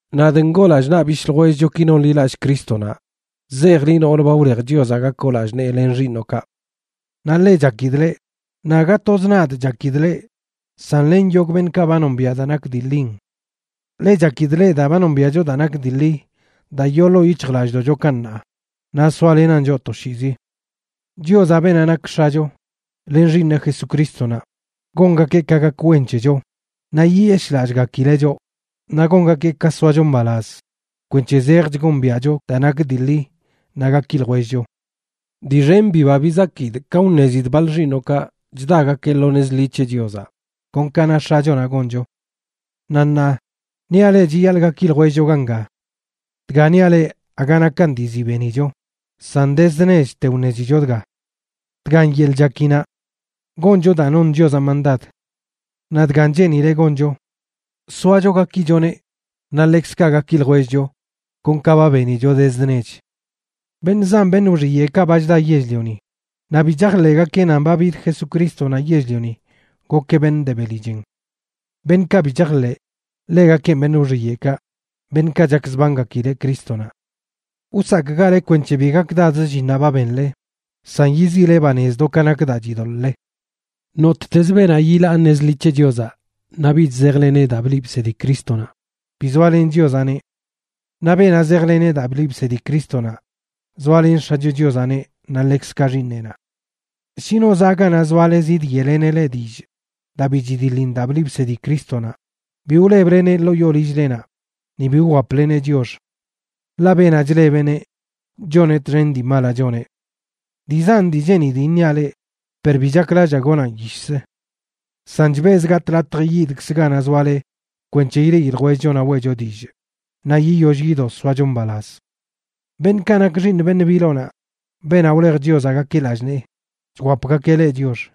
Nadꞌ ngoo lallꞌ naꞌ bishꞌ ljwellchoki nonḻilallꞌ Crístonaꞌ chzejꞌ liꞌ, noolə ba wlej Chiozaꞌ gakoꞌ lallꞌ nee len xiiṉoꞌkaꞌ.a Naꞌ ḻe chakidꞌ leꞌ, naꞌ aga toz nadꞌ chakidꞌ leꞌ san len yogꞌ beṉꞌkaꞌ ba nombiaꞌ daa nak dii ḻin. Ḻe chakidꞌ leꞌ daa ba nombiaꞌcho daa nak dii ḻi daa yoo ḻoo yic̱hjlallꞌdoꞌchokaꞌ ṉaa, naꞌ soalenan choꞌ toshiizi. Chiozaꞌ, beenaꞌ nak X̱acho, len Xiiṉeꞌ Jesucrístonaꞌ, gongakeꞌ ka gak wen c̱hecho, naꞌ yiyeshꞌlallꞌgakileꞌ choꞌ, naꞌ gongakeꞌ ka soacho mbalaz kwenc̱he zejch gombiaꞌcho daa nak dii ḻi naꞌ gaki ljwellcho. Dii xen biba bizakidꞌ ka wṉezidꞌ baḻ xiiṉoꞌkaꞌb chdagakeꞌ lo nez ḻi c̱he Chiozaꞌ, kon ka na X̱achonaꞌ goncho. Naꞌ ṉaa, niaꞌ leꞌ chiyaḻꞌ gaki ljwellcho ganga. Dga niaꞌ leꞌ aga nakan dii ziꞌ benicho, san dezd nechte wṉezicho dga. Dgan yeḻꞌ chakinaꞌ: goncho daa non Chiozaꞌ mandad. Naꞌ dgan cheenileꞌ goncho: soacho gakichoneꞌ naꞌ ḻekzkaꞌ gaki ljwellcho kon ka ba benicho dezd nech. Beṉꞌ zan beṉꞌ wxiyeꞌkaꞌ ba chda yell-lioni, naꞌ bi chajḻeꞌgakeꞌ nan ba bid Jesucrístonaꞌ yell-lioni gokeꞌ beṉꞌ de beli chen. Beṉꞌkaꞌ bi chajḻeꞌ, ḻegakenꞌ beṉꞌ wxiyeꞌkaꞌ, beṉꞌkaꞌ chakzbangakileꞌ Crístonaꞌ. Wsakꞌgale kwenc̱he bi gakdadz llinnaꞌ ba benle, san yiziꞌle banez do ka nak daa chidoḻꞌle. Nottezə beenaꞌ yilaa nez ḻi c̱he Chiozaꞌ naꞌ bich zejleneꞌ daa bliꞌ bsedi Crístonaꞌ, bi zoalen Chiozaꞌneꞌ. Naꞌ beenaꞌ zejlen daa bliꞌ bsedi Crístonaꞌ, zoalen X̱acho Chiozaꞌneꞌ naꞌ ḻekzkaꞌ Xiiṉeꞌnaꞌ. Shi no zaꞌ ganaꞌ zoale zidyeꞌleneꞌ leꞌ dillꞌ daa bi chidiḻin daa bliꞌ bsedi Crístonaꞌ, bi wlebleneꞌ ḻoo yoo lill-lenaꞌ, ni bi wwapleneꞌ chiox. Ḻaꞌ beenaꞌ chlebeꞌneꞌ, choneꞌ txen dii malaꞌ choneꞌ. Dii zan dii cheenidꞌ iṉiaꞌ leꞌ, per bi chaklallaa gonaꞌn yishzə. San chbezꞌ gatꞌ latj yidkzꞌ ganaꞌ zoale kwenc̱he ileꞌi ljwellcho naꞌ weꞌcho dillꞌ, naꞌ yiyoll yido soacho mbalaz. Beṉꞌkaꞌ nak xiiṉ beṉꞌ biloꞌnaꞌ,c beenaꞌ wlej Chiozaꞌ gakeꞌ lallꞌ nee, chwapgakeꞌ leꞌ chiox.